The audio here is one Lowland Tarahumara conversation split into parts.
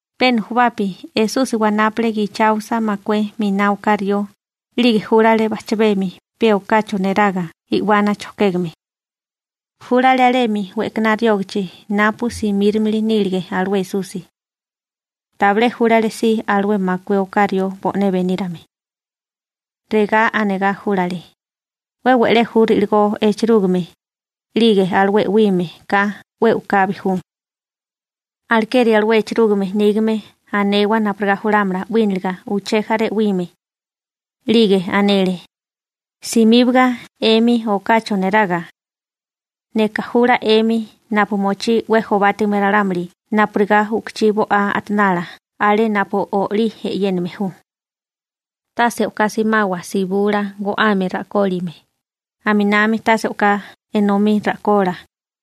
Pe nujubapi Esusi wanápale gicháosa makué miná oká rió, 'lige júlale bajchabemi pe okacho neraga i'wana chojkégame. Júlale alemi we'kaná riógachi napu simírimili nílige alué Esusi. Tabilé júlale si alué makué oká rió bo'né benírame. Regá anegá júlale: ―'We we'lé ju ri'ligó echerúgime, 'lige alué 'wime ka 'we u'kabi ju. Alekeri alué echerúgime nígame anewa napurigá julámala 'wíniliga uché jaré 'wime. 'Lige anele: ―Simíbaga 'emi okacho neraga. Neka jula 'emi napu mochí 'we jobátigame ralámuli napurigá u'kuchí bo'á a'tanala alé napu olí e'yéname ju. Tase o'ká simawa sibula go'ame ra'kólime, aminami tase enomí ra'kola,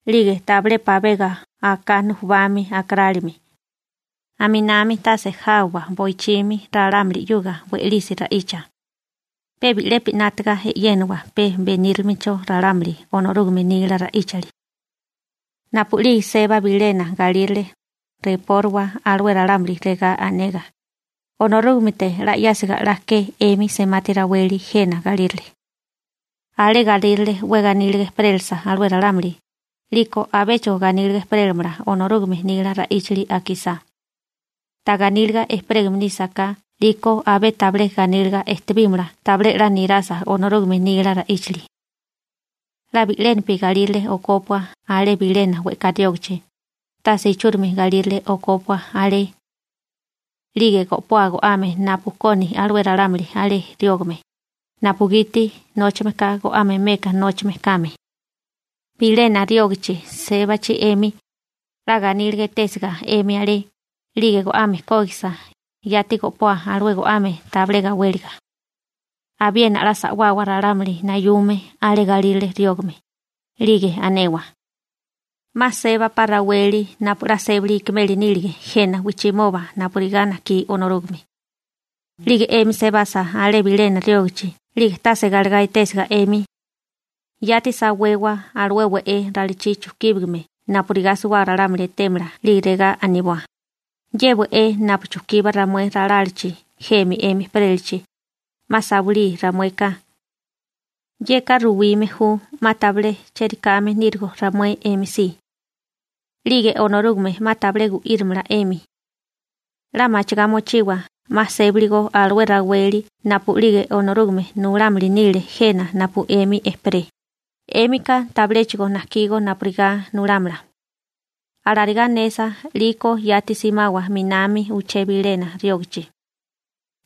'lige tabilé pabega aká nujubami akarálime. Aminami tase jábawa boichimi ralámuli 'yuga we'lisi ra'icha. Pe bi'lepi 'nátaga e'yénawa pe benírilimecho ralámuli Onorúgame nila ra'íchali. › Napu'lige seba bilena galírale, repóriwa alué ralámuli regá anegá: «Onorúgamete 'la 'yásiga 'la ke 'emi semati raweli jena galírale.» Alé galírale 'we ganíliga ejperélasa alué ralámuli, 'liko abéchigo ganíliga ejperélamala Onorúgame nila ra'íchali akisá. Ta ganíliga ejperégame nísaká 'liko abé tabilé ganíliga ejtebímala tabilé 'la nirasa Onorúgame nila ra'íchali. 'La bi'lénapi galírale okópua alé bilena we'ká riógachi, tase ichúrimi galírale okópua alé. 'Lige go'poa go'ame napu koni alué ralámuli alé riógame, napugiti nóchameka go'ame meka nóchame kame. › Bilena riógachi sébachi 'emi, 'la ganíliga etésiga 'emi alé, 'lige go'ame kógisiga, yati go'poa alué go'ame tabilé gawéliga. Abiena 'la sa'wawa ralámuli nayume alé galírale riógame, 'lige anewa: «'Ma sébapá raweli napu 'la sébali ikimeli nílige jena wijchimoba napurigá najkí Onorúgame.» 'Lige 'emi sebasa alé bilena riógachi 'lige tase galegá etésiga 'emi, yati sawewa alué we'é ralachí chujkíbigame napurigá suwábaga ralámuli etémala 'lige regá aniboa: «Ye we'é napu chujkiba ramué ralálachi jemi 'emi ejperélachi, 'ma sawilí ramueka. Yeka ruwime ju 'ma tabilé cheri kame nírigo ramué 'emi si. 'Lige Onorúgame 'ma tabilé gu'írimala 'emi. 'La machigá mochiwa 'ma sébigo alué raweli napu'lige Onorúgame nulámili nile jena napu 'emi ejperé, 'émika tabiléchigo najkígó napurigá nulámala.» Alarigá anesa 'liko yati simawa 'minami uché bilena riógachi.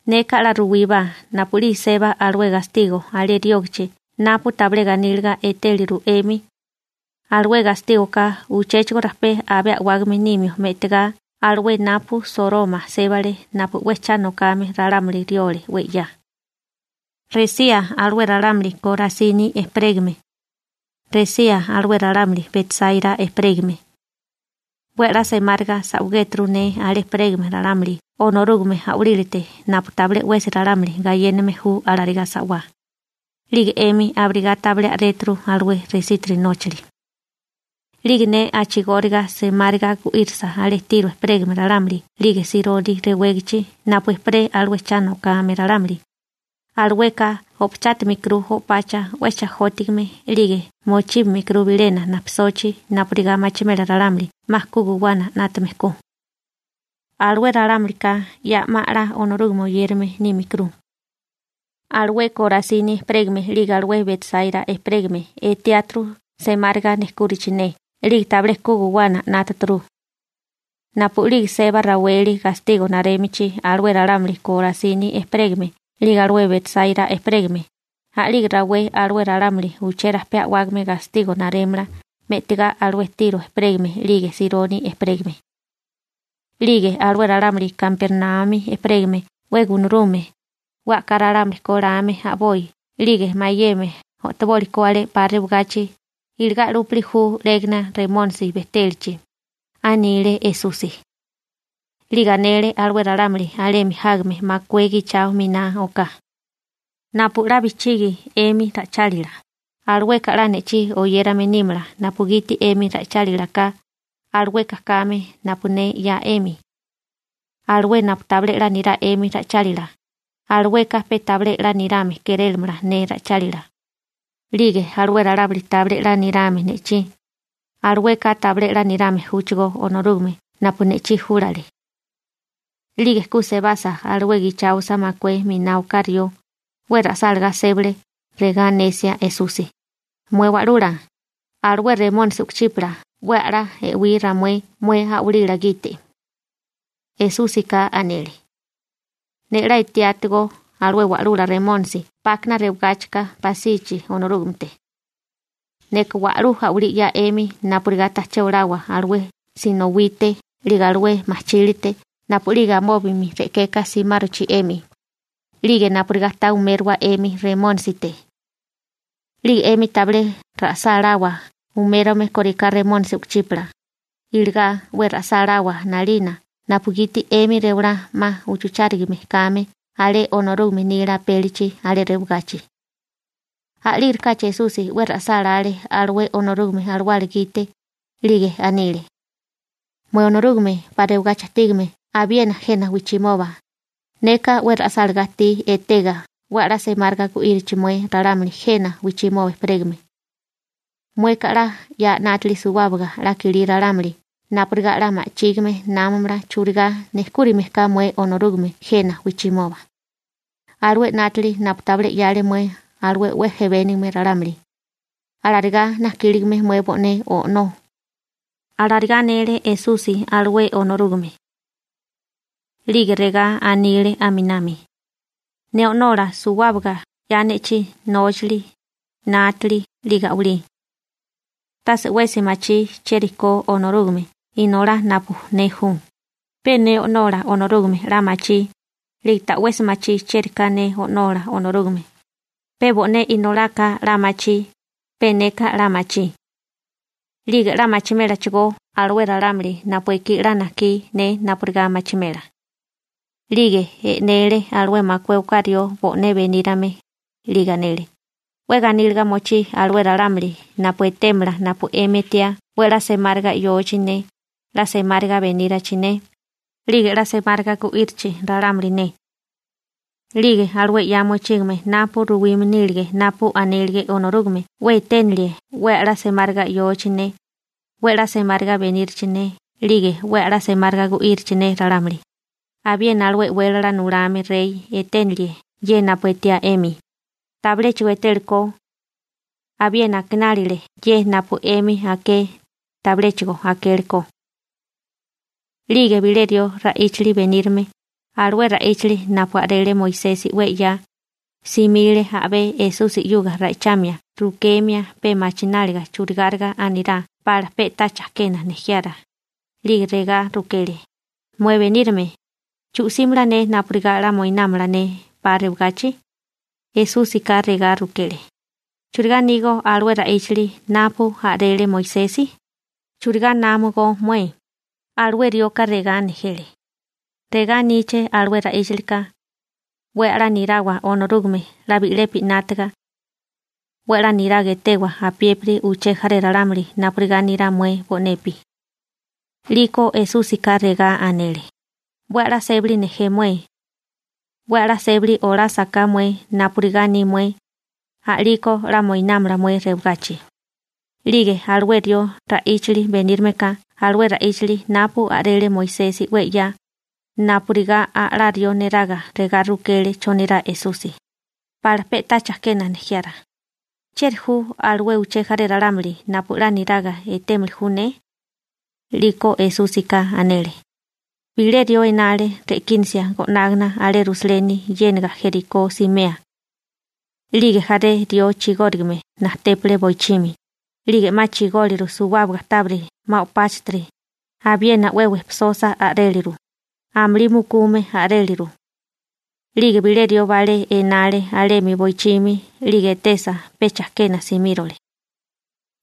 Neka 'la ruwíbá napu'lige seba alué gastigo alé riógachi napu tabilé ganíliga etéliru 'emi, alué gastígoká uchéchigo rajpé abé a'wágame nimio me'tagá alué napu Soroma sébale napu 'we cha nokame ralámuli riole 'we 'ya. › Resía alué ralámuli Korasini ejperégame. Resía alué ralámuli Betsaira ejperégame. 'We a'lá semáriga sa'wagéturu ne alé ejperégame ralámuli Onorúgame a'walílate napu tabilé 'wesi ralámuli gayéname ju alarigá sa'wá, 'lige 'emi abirigá tabilé a'réturu alué resítiri nóchali. 'Lige ne a'chigóriga semáriga gu'írisa alé Tiro ejperégame ralámuli 'lige Sironi rewégachi napu ejperé alué cha nokame ralámuli, alueka o'pachátimikuru o'pacha 'we chajótigame 'lige mochíbimikuru bilena najpisochi napurigá machimela ralámuli 'ma ku guwana 'nátame ko. Alué ralámulika ya 'ma 'la Onorúgame oyérame nímikuru. Alué Korasini ejperégame 'lige alué Betsaira ejperégame etiáturu semáriga nejkúrichi ne 'lige tabilé ku guwana 'nátaturu. Napu'lige seba raweli gastigo narémichi alué ralámuli Korasini ejperégame 'lige alué Betsáira ejperégame, a'lige rawé alué ralámuli uchérajpé a'wágame gastigo narémala me'tigá alué Tiro ejperégame 'lige Sironi ejperégame. 'Lige alué ralámuli Kapernaumi ejperégame 'we gunarume, 'we a'ká ralámuli ko lame a'boi 'lige mayeme o'toboli ko alé 'pa rewagachi, iligá 'lúpili ju 'légana Remónisi bejtélachi ―anile Esusi. 'Lige anele alué ralámuli alemi jágame makué gichao miná oká: ―Napu 'la bijchigi 'emi ra'ichálila, alueka 'la ne'chí oyérame nímala napugiti 'emi ra'ichálila ka, alueka kame napu ne 'ya 'emi. Alué napu tabilé 'la nirá 'emi ra'ichálila, alueka pe tabilé 'la nirame kérélamala ne ra'ichálila. 'Lige alué ralámuli tabilé 'la nirame ne'chí, alueka tabilé 'la nirame júchigó Onorúgame napu ne'chí júlale. 'Lige ku sebasa alué gicháosa makué miná oká rió, 'we ra'sálagá sébale, regá anesia Esusi: ―Mué Wa'lula, alué remónisi u'kuchípala 'we a'lá e'wí ramué mué a'walila gite. Esúsika anele: ―Ne 'la etiátigó alué wa'lula Remónisi 'pákana rewagáchikana pasichi Onorúgamete. Neka wa'lú a'walí 'ya 'emi napurigá tajché olawa alué sinowite 'lige alué majchílite napu'lige amóbami re'keka simárochi 'emi, 'lige napurigá ta umérowa 'emi Remónisite. 'Lige 'emi tabilé ra'sáláwa umérome kóriká remónisi u'kuchípala, iligá 'we ra'sáláwa 'nalina napugiti 'émi rewalá 'ma uchuchárigame kame alé Onorúgame nila apélichi alé rewagachi. A'lígirikáchi Esusi 'we ra'sálále alué Onorúgame Alawala gite, 'lige anile: ―Mué Onorúgame 'pa rewagachi ajtígame abiena jena wijchimoba, neka 'we ra'sálagá ajtí etega 'we a'lá semáriga gu'írichi mué ralámuli jena wijchimoba ejperégame. Mueka 'la 'ya 'nátili suwábaga 'la kilí ralámuli napurigá 'la ma'chígime námamala churigá nejkúrime ka mué Onorúgame jena wijchimoba, alué 'nátili napu tabilé 'yale mué alué 'we jebénigame ralámuli, alarigá najkíligame mué bo'né O'nó ―alarigá anele Esusi alué Onorúgame. 'Lige regá anile aminami: ―Ne O'nola suwábaga 'ya ne'chí nóchali, 'nátili, 'lige a'walí. Tase 'wesi machí chieri ko Onorúgame Inolá napu ne ju, pe ne O'nola Onorúgame 'la machí, 'lige ta'wesi machí chieri ka ne O'nola Onorúgame, pe bo'né Inolaka 'la machí, pe neka 'la machí. 'Lige 'la machimélachigó alué ralámuli napu ekí 'la najkí ne napurigá machimela. 'Lige e'nele alué makué oká rió bo'né benírame, 'lige anele: ―'We ganíliga mochí alué ralámuli napu etémala napu 'emi etiá 'we a'lá semáriga 'yochi ne, 'la semáriga benírachi ne, 'lige 'la semáriga gu'írichi ralámuli ne. 'Lige alué 'ya mochígame napu ruwime nílige napu anélige Onorúgame 'we eténelie 'we a'lá semáriga 'yochi ne, 'we a'lá semáriga benírachi ne 'lige 'we a'lá semáriga gu'írichi ne ralámuli, abiena alué e'wélala nulame rey eténelie ye napu etiá 'emi, tabiléchigo etélekó. Abiena akinálile ye napu 'emi aké, tabiléchigo akéleko. 'Lige bilé rió ra'íchali benírame, alué ra'íchali napu a'rele Moisesi 'we 'ya, simile a'bé Esusi 'yuga ra'ichamia rukemia pe machináliga churigáriga anirá pala pe'tá chajkena nejiara, 'lige regá rukele: ―Mué Benírame, ¿chu'símala ne napurigá 'la moinámala ne 'pa rewagachi? Esúsika regá rukele: ―¿Churigá anígó alué ra'íchali napu a'rele Moisesi? ¿Churigá námogo mué? Alué rioka regá nejele: ―Regá aníché alué ra'íchalika: «'We a'lá nirawa Onorúgame 'la bi'lepi 'nátaga. 'We a'lá niraga etewa apiépiri uché jaré ralámuli napurigá nirá mué bo'nepi.» 'Liko Esúsika regá anele: ―'We a'lá sébali nejé mué. 'We 'la sébali olásaká mué napurigá aní mué, a'liko 'la moinámala mué rewagachi. 'Lige alué rió ra'íchali benírameka alué ra'íchali napu a'rele Moisesi 'we 'ya, napurigá a'lá rió neraga regá rukele chonirá Esusi, pala pe'tá chajkena nejiara: ―¿Chieri ju alué uché jaré ralámuli napu 'la niraga etémili ju ne? 'Liko Esúsika anele: ―Bilé rió enale re'kínasia go'nágana alé Rusaleni 'yéniga Jerikó simea. 'Lige jaré rió chigórigame najtépale boichimi, 'lige 'ma chigóliru suwábaga tábiri 'ma o'páchatiri, abiena 'we wejpisosa a'réliru, amulí mukume a'réliru. 'Lige bilé rió balé enale alemi boichimi 'lige etesa pe chajkena simírole.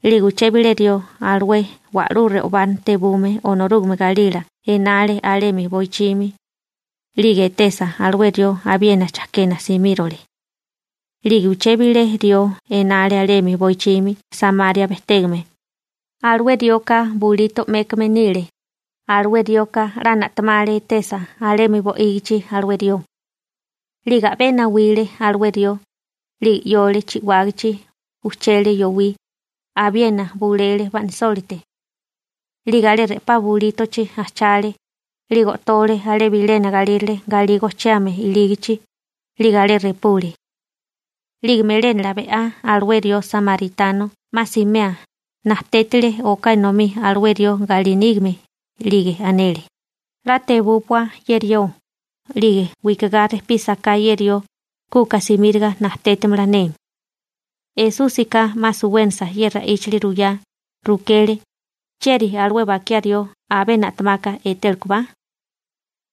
'Lige uché bilé rió alué wa'lú re'obá tebume Onorúgame galila enale alemi boichimi, 'lige etesa alué rió abiena chajkena simírole. 'Lige uché bilé rió enale alemi boichimi Samaria bejtégame, alué rioka bulito 'mékame nile, alué rioka 'la na'temale etesa alemi bo'ígichi alué rió. 'Lige a'bé nawile alué rió, 'lige 'yole chi'wágichi, ujchele yowí, abiena bulele ba'nisólite. 'Lige alé re'pá bulítochi ajchale, 'lige o'tole alé bilena galírale galí gojchiame ilígachi, 'lige alé repule. 'Lige melénala be'á alué rió samaritano 'ma simea, najtétile oká enomí alué rió galí nígame, 'lige anele: «'La tebúpua ye rió, 'lige wikagá rejpísaká ye rió, kuka simíriga najtétimala ne.» Esúsika 'ma suwénasa ye ra'íchali ruyá, rukele: ―¿Chieri alué bakiá rió abé na'temaka etélekobá?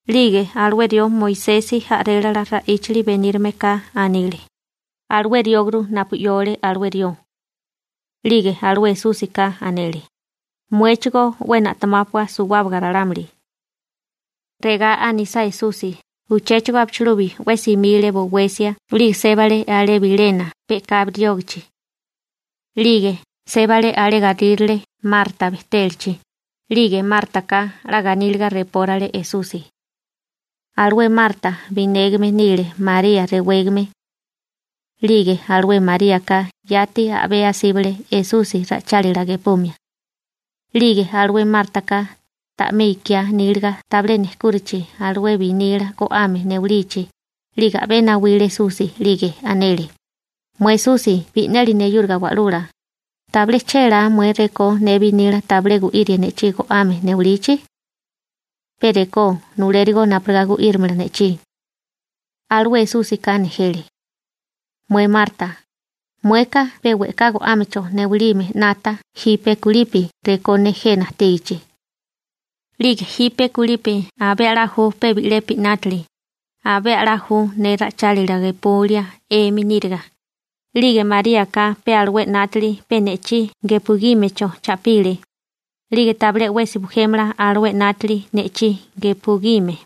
'Lige alué rió Moisesi a'rélala ra'íchali benírameka anile: ―Alué rióguru napu 'yole alué rió. 'Lige alué Esúsika anele: ―Muéchigó 'we na'temápua suwábaga ralámuli. Regá anisá Esusi uchéchigo abichilubi 'we simile bowesia 'lige sébale alé bilena pe'kabi riógachi. 'Lige sébale alé galírale Marta bejtélachi, 'lige Mártaka 'la ganíliga repórale Esusi. Alué Marta binégame nile María rewégame. 'Lige alué Maríaka yati a'bé asíbale Esusi ra'ichálila gepumia. 'Lige alué Mártaka, ta'mé ikiá níliga tabilé nejkúrachi alué binila go'ame newilichi, 'lige a'bé nawile Esusi 'lige anele: ―Mué Esusi bi'neli neyúriga wa'lula, ¿tabilé chélá mué rekó ne binila tabilé gu'írie ne'chí go'ame newalichi? Pe rekó nulérigó napurigá gu'írimala ne'chí. Alué Esúsika nejele: ―Mué Marta, mueka pe we'ká go'ámecho newalime 'nata jipe kulipi rekó ne jena ajtígichi. 'Lige jipe kulipi abé a'lá ju pe bi'lepi 'nátili, abé a'lá ju ne ra'ichálila gepulia 'emi níriga, 'lige Maríaka pe alué 'nátili pe ne'chí gepugímecho cha'pile, 'lige tabilé 'wesi bujémala alué 'nátili ne'chí gepugime.